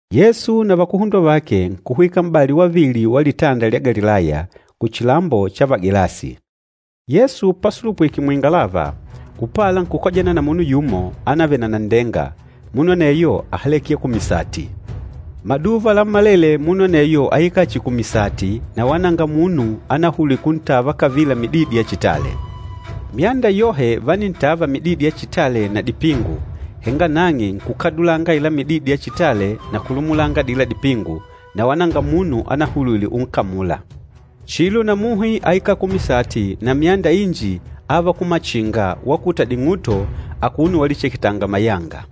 Yesu na vakuhundwa vake nkuhwika m'bali wavili wa Litanda lya Galilaya, kuchilambo cha Vagelasi. Yesu pasulupwike muingalava, upala nkukojana na munu yumo ánavele na nanndenga, munu aneyo áhaleke ya kumisati. Maduva lammalele munu aneyo áikala chihi kumisati na wala nanga munu anahulwile kuntava kavila mididi ya chitale. Myanda yohe vánintava mididi ya chitale na dipingu, henga nang'e nkukadulanga aila mididi ya chitale na kulumulanga adila dipingu, na wala nanga munu anahulwile unkamula. Chilo na muhi áikala kumisati na myanda inji áva kumachinga wakuta ding'uto akuno walicheketanga mayanga.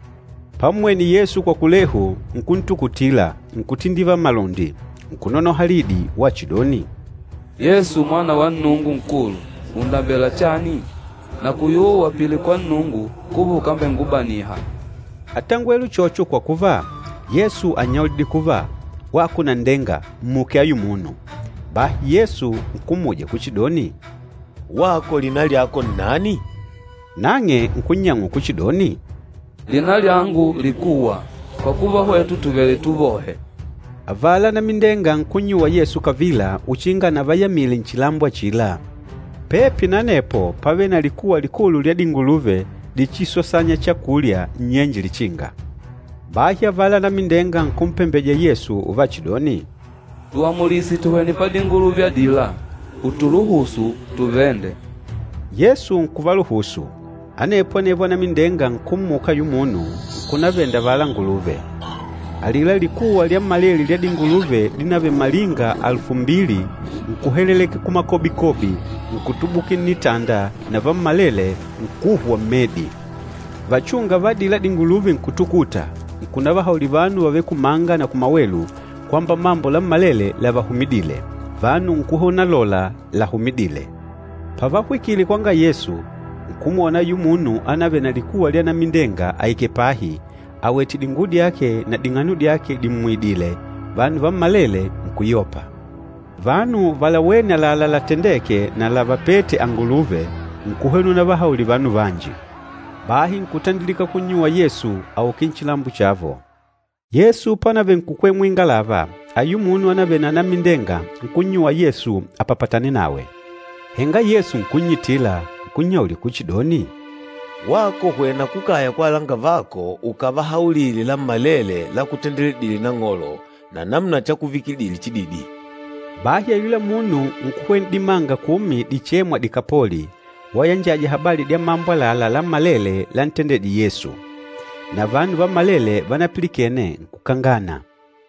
Pammwene Yesu kwa kulehu, nkuntukutila nkutindivala malundi. Nkunonoha lidi wachidoni, “Yesu Mwana wa Nnungu Nkulu, ùndambela chani? Nakuyuwa uapile kwa Nnungu kuva ukambengubaniha!” Átangwele uchocho kwa kuva, Yesu ánnyaulidile kuva, “Wako nanndenga, mmuke ayu munu!” Bahi Yesu nkummuja kuchidoni, “Wako lina lyako nnani?” Nang'e nkunnyang'ula kuchidoni, “Lina lyangu Likuwa, kwa kuva hwetu tùvele tuvohe.” Avala anamindenga nkunnyuwa Yesu kavila uchinga anavayamile nchilambo achila. Pepi na anepo pávele na likuwa likulu lya dinguluve dichisosanya chakulya nnyenje lichinga. Bahi avala anamindenga nkumpembeja Yesu uvachidoni, “Tuamulise tuhwene padinguluve adila, ùtuluhusu tuvende.” Yesu nkuvaluhusu. Anepo anevo anamindenga nkummuka ayula munu, nkunavenda avala anguluve. Alila likuwa lyammalele lya dinguluve dínavele malinga alufu mbili, nkuhelelekela kumakobikobi, nkutubukila nnitanda na vammalele nkuhwa mmedi. Vachúnga va adila dinguluve nkutukuta, nkunavahaulila vanu vavêle kumanga na kumawelu kwamba mambo lammalele lavahumidîle. Vanu nkuhwena unalola lahumidîle. Pavahwikile kwanga Yesu, nkumwona ayula munu ánavele na likuwa lya anamindenga aikèlè pahi, awètè dinguwo dyake na ding'ano dyake dimmuidìlè, vanu vammalele nkuyopa. Vanu valawêne àlalá latendêke na lavapête anguluve, nkuhwena unavahaulila vanu vanji. Bahi nkutandilika kunnyuwa Yesu auke nchilambo chavo. Yesu pánavele nkukwela muingalava, ayula munu ánavele na anamindenga nkunnyuwa Yesu apapatane nawe. Henga Yesu nkunnyitila. Nkunnyaulila kuchidoni, “Wako hwena kukaya kwa alangavako ukavahaulile lammalele lakutendedîle Nang'olo na namuna chakuvikidile chididi.” Bahi ayula munu nkuhwena n'dimanga kumi dichêmwa Dikapoli, wayanjaja habali dya mambo àlalá lammalele lántendedìlè Yesu. Na vanu vammalele vanapilikene, nkukangana.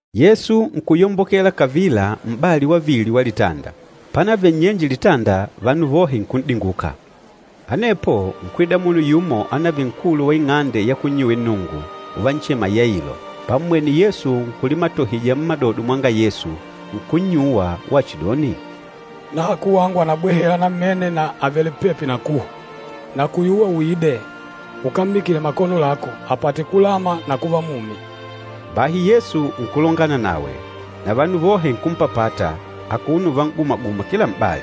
Yesu nkuyombokela kavila m'bali wavili wa litanda. Pánavele nnyenje litanda, vanu vohe nkun'dinguka. Anepo nkwida munu yumo ánavele nkulu wa ing'ande ya kunnyuwila Nnungu, uvanchema Yailo. Pammwene Yesu nkulimatohija mmadodo mwanga Yesu, nkunnyuwa wachidoni, “Nahaku wangu ànabwahela namene na àvele pepi na kuhwa. Nakuyuwa uide, ukammikile makono lako, apate kulama na kuva mumi.” Bahi Yesu nkulongana nawe. Na vanu vohe nkumpapata, akuno uvan'gumaguma kila m'bali.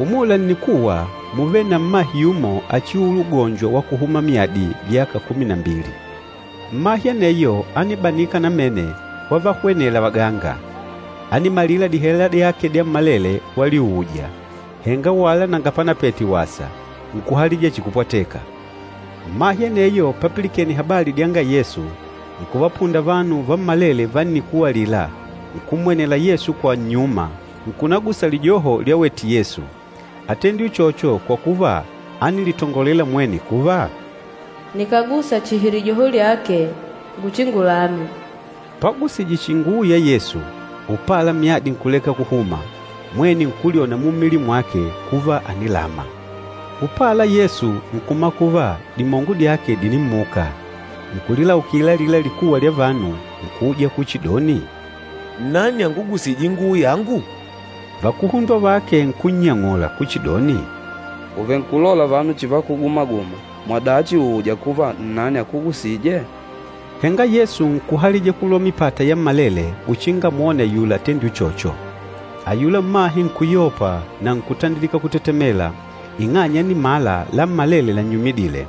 Umula nnikuwa múvele na mmahe yumo achiuula ugonjo wa kuhuma myadi vyaka kumi na mbili. Mmahe aneyo ánibanika namene wavahwenela vaganga. Ánimalila dihela dyake dyammalele waliuuja, henga wala nanga panapete wasa, nkuhalija chihi kupwateka. Mmahe aneyo papilikene habali dyanga Yesu, nkuvapunda vanu vammalele va nnikuwa alila, nkummwenela Yesu kwa nnyuma, nkunagusa lijoho lyawete Yesu. Átendile uchocho kwa kuva ánilitongolela mwene kuva, “Nikàgusa chihi lijoho lyake nguchingulame.” Pagusije chihi inguwo ya Yesu, upala myadi nkuleka kuhuma, mwene nkulyona mummili mwake kuva ànilama. Upala Yesu nkumala kuva dimongo dyake dìnimmuka. Nkulilaukila alila likuwa lya vanu, nkuuja kuchidoni, “Nnani angugusîje inguwo yangu?” Vakuhundwa vake nkunnyang'ula kuchidoni, “Ùvenkulola vanu chivakuguma-guma, mwadachi ùuja kuva nnani akugusîje?” Henga Yesu nkuhalija kulola mipata yammalele uchinga amwone ayula atendîle uchocho. Ayula mmahe nkuyopa na nkutandilika kutetemela, ing'anya ánimala lammalele lannyumidile.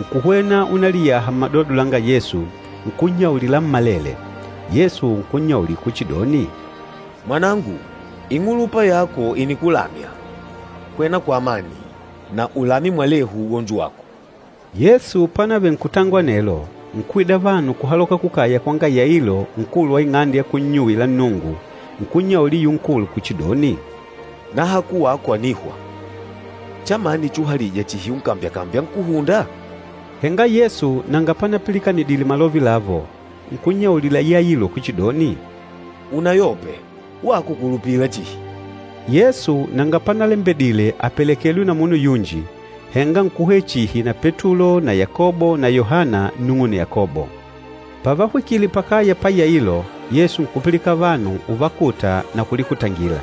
Nkuhwena unaliyaha mmadodo langa Yesu, nkunnyaulila lammalele. Yesu nkunnyaulila kuchidoni, “Mwanangu, ing'ulupa yako ìnikulamya. Hwena kwa amani, na ulame mwelehu ugonjo wako.” Yesu pánavele nkutongola anelo, nkwida vanu kuhaloka kukaya kwanga Yailo nkulu wa ing'ande ya kunnyuwila Nnungu, nkunnyaulila ayula nkulu kuchidoni, “Nahaku wako ànihwa. Chamani chuhalija chihi unkambyakambya Nkúhunda?” Henga Yesu nanga panapilikanidile malove lavo, nkunnyaulila Yailo kuchidoni, “Unayope, wako kulupila chihi.” Yesu nanga panalembedile apelekelwe na munu yunji, henga nkuhwena chihi na Petulo na Yakobo na Yohana nnung'une Yakobo. Pavahwikile pakaya pa Yailo, Yesu nkupilikana vanu uvakuta na kulikutangila.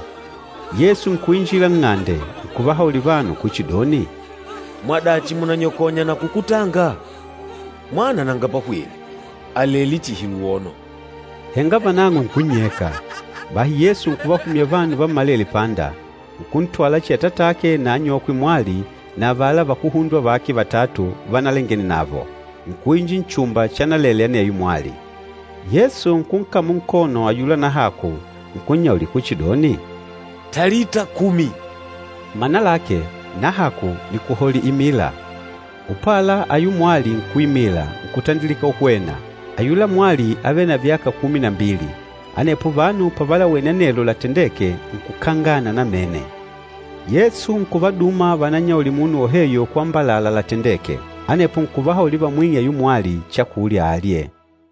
Yesu nkuinjila nng'ande, nkuvahaulila vanu kuchidoni, “Mwadachi mùnanyakonya na kukutanga? Mwana nanga pahwile, àlele chihi luwono.” Henga vanang'o nkunnyeka. Bahi Yesu nkuvahumya vanu vammalele panda, nkuntwala chihi atatake na anyokwe mwali na avala vakuhundwa vake vatatu vanalangene navo, nkuinjila nchumba chanalele aneyo mwali. Yesu nkunkamula nkono ayula nahaku, nkunnyaulila kuchidoni, “Talita kumi!” Mana lake, “Nahaku nìkuhaulila imila!” Upala, ayula mwali nkuimila, nkutandilika uhwena. Ayula mwali ávele na vyaka kumi na mbili. Anepo vanu pavalawene anelo latendêke, nkukangana namene. Yesu nkuvaduma vananyaulile munu woheyo kwamba àlalá latendêke. Anepo nkuvahaulila vamwing'e ayula mwali chakulya alye.